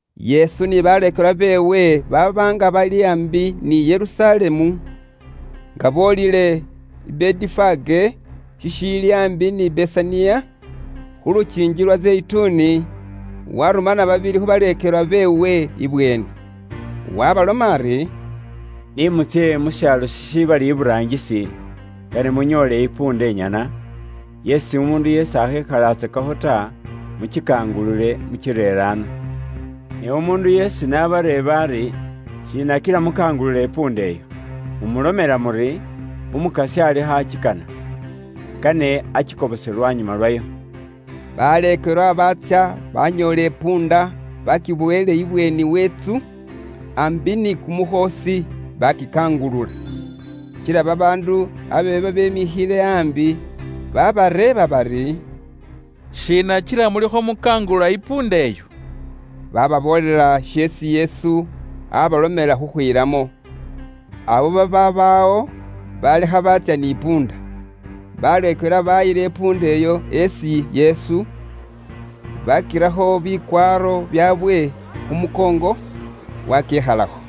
Yesu ni baleekelwa beewe baaba nga bali aambi ni Yerusalemu, nga boolile i Betifage shishiili aambi ni Besaniya, khu lukiingi lwa Zeyituni, warumana babili khu baleekelwa beewe ibweeni. Wabaloma ari, “Ni mutsye mu shaalo shishibali iburaangisi, kane munyoole isikilya inyana, yeesi umuundu yeesi akhekhalatsakakho ta, mukikangulule mukirere ano. Ne umuundu yeesi n'abareeba ari, ‘Shiina kila mukangulula isikilya iyo?’ Mumulomela muri, ‘Umukasya alikho akikana. Kane akikobose lwanyuma lwayo.’” Baleekelwa baatsya banyoola isikilya baakibowele imulyaango we intsu, aambi ni kumukhoosi, baakikangulula. Kila babaandu abe babemikhile aambi baabareeba bari, “Shiina kila mulikho mukangulula isikilya iyo?” Bababoolela sheesi Yesu abalomela khukhwilamo, abo babaaba awo, baabalekha baatsya ni sikilya. Baleekelwa baayila isikilya iyo isi Yesu, baakirakho bikwaaro byaabwe khu mukoongo, waakiikhalakho.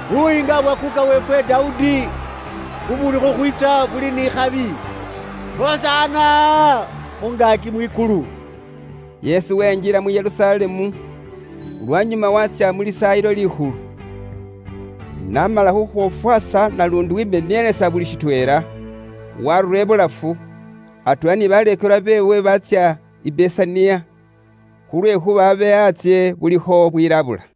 Buyiinga bwa kuuka weefwe Dawudi, bubuuli khukhwiitsa buli ni ikhabi. Hosana mu ngaaki mwikulu!” Yesu wenjila mu Yerusalemu, lwanyuma waatsya mu Lisaayilo Likhulu. N'amala khukhwofwaasa naluundi wemenielesa buli shitweela, waarura ibulafu, atweela ni baleekelwa beewe baatsya i Besaniya, khulwekhuuba abe antsye bulikho bwilabula.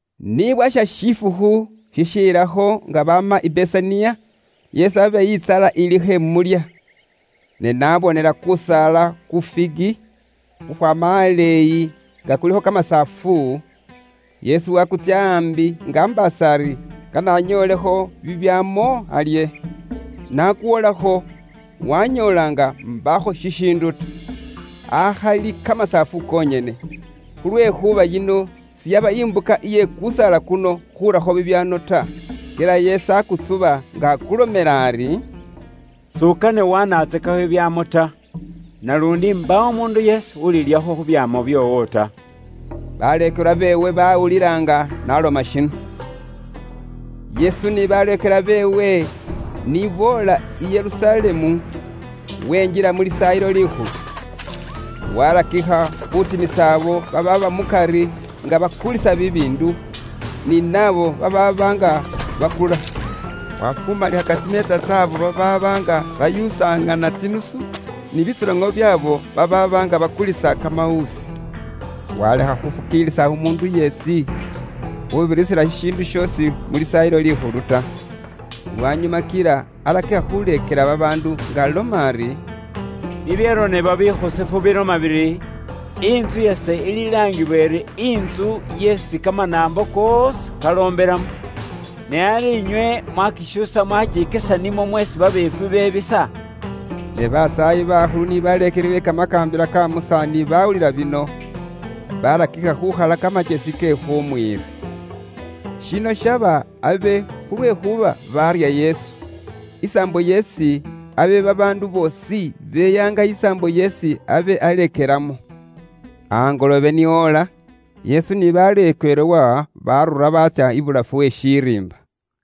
Ni bwasha shifukhu shishelakho nga baama i Besaniya, Yesu abe intsala ilikho imulya. Ne niye n'abonela kusaala ku figi khukhwaama aleeyi nga kulikho kamasaafu, Yesu waakutsya aambi nga ambaasa ari kane anyoolekho bibyaamo alye. N'akwolakho, wanyoola nga mbaakho shishiindu ta, akhali kamasaafu konyene, khulwekhuuba yino siyaba imbuka iye kusaala kuno khurakho bibyaamo ta. Kila Yesu akutsuba nga akulomela ari, “S'ukane wanatsakekho bibyaamo ta, naluundi mbaawo umuundu yeesi ulilyakho khu bibyaamo byoowo ta!” Baleekelwa beewe bawulila nga n'aloma shino. Yesu ni baleekelwa beewe ni boola i Yerusalemu, wenjila mu Lisaayilo Likhulu. Waarakikha khuutimisa abo babaaba mukari nga bakulisa bibiindu, ni nabo babaaba nga bakula. Waafumalikhaka tsimeetsa tsy'abo babaaba nga bayuusaŋana tsinusu, ni bitsoloŋo byaabo babaaba nga bakulisa kamawuusi. Waalekha khufukiilisa umuundu yeesi khuubirisila shishiindu shoosi mu Lisaayilo Likhulu ta. Lwanyuma kila arakikha khuuleekela babaandu nga aloma ari, “Bibyaronebwa bikhosefu biloma biri, ‘Intsu yase ililaangibwa iri intsu yeesi kamanaambo koosi kaloombelamo.’ Ne ari inywe mwakishuusa mwakikesa nimwo mweesi babiifwi bebisa.” Ne basaayi bakhulu ni baleekeli be Kamakaambila ka Musa ni baawulila bino, baarakikha khuukhala kamakyesi ke khumwiira. Shino shaba abe khulwekhuuba barya Yesu, isaambo yeesi abe babaandu boosi beyaanga isaambo yeesi abe aleekelamo. Angoloobe ni oola, Yesu ni baleekelwa baarura baatsya ibulafu we shiriimba.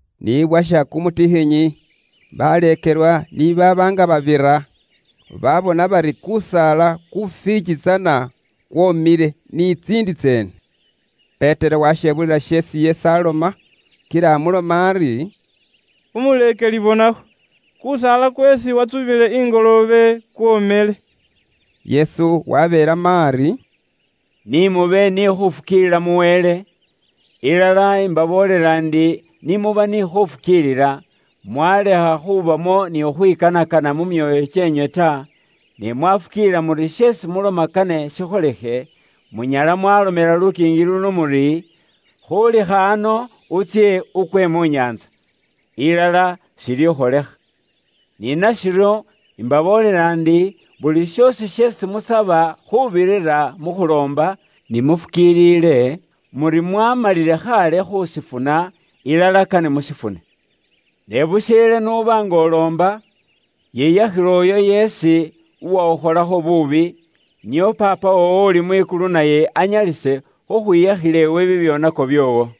Ni bwasha kumutikhinyi, baleekelwa ni baaba nga babira, baabona bari kusaala ku figi tsana kwoomile, ni tsiindi tseene. Petero washebulila sheesi Yesu aaloma, kila amuloma ari, “Umuleekeli bonakho! Kusaala ku figi kweesi watsubile ingoloobe kwomile.” Yesu wabeelamo ari, “Ni mube ni khufukiilila mu Wele. Kor 13.2Ilala, imbaboolela indi ni muba ni khufukiilila, mwalekha khubamo ni khukhwikanakana mu myoyo kyeenywe ta, ne mwafukiilila muri sheesi muloma kane shikholikhe, munyala mwaalomela lukiingi luno muri, ‘Khuulikha ano utsye ukwe mu nyaantsa,’ ilala shilikholikha. Ni nashiryo, imbaboolela indi, buli shoosi sheesi musaba khuubirira mu khuloomba, ni mufukiilile muri mwaamalile khaale khushifuna, ilala kane mushifune. “Ne busheele n'uba nga uloomba, yiyakhila uyo yeesi uwakhukholakho buubi; nio Paapa woowo uli mwikulu naye anyalise khukhwiyakhila iwe bibyoonako byoowo.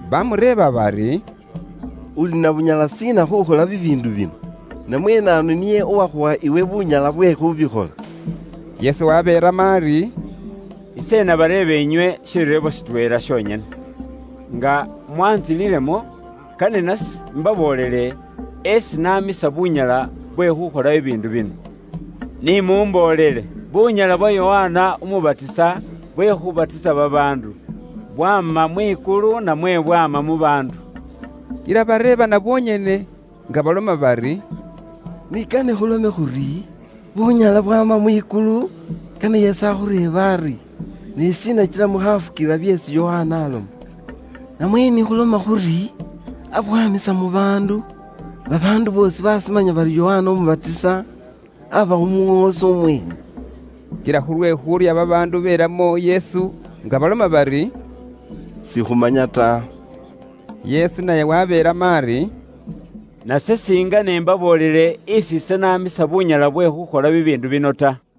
Baamureeba bari, “Uli na bunyala shiina khuukhola bibiindu bino? Namwe naanu niye uwakhuwa iwe bunyala bwe khuubikhola?” Yesu wabeelamo ari, “Ise inabareeba inywe shireebo shitweela shonyene; nga mwantsililemo, kane nase imbaboolele esi namisa bunyala bwe khukhola bibiindu bino. Ni mumboolele: bunyala bwa Yokana Umubatisa bwe khubatisa babaandu, bwama mwikulu, namwe bwama mu baandu?” Kila bareebana bonyene nga baloma bari, “Ni kane khulome khuri, ‘Bunyala bwama mwikulu,’ kane Yesu akhureebe ari, ‘Ne shiina kila mukhafukiilila byeesi Yokana aloma?’ Namwe ni khuloma khuri, abwamisa mu baandu, babaandu boosi bashimanya bari Yokana Umubatisa aba umuŋoosi umweene.” Kila khulwe khuurya babaandu belamo Yesu nga baloma bari, “Sikhumanya ta.” Yesu naye wabeelamo ari, “Nase singene imbaboolele esi ise namisa bunyala bwe khukhola bibiindu bino ta.”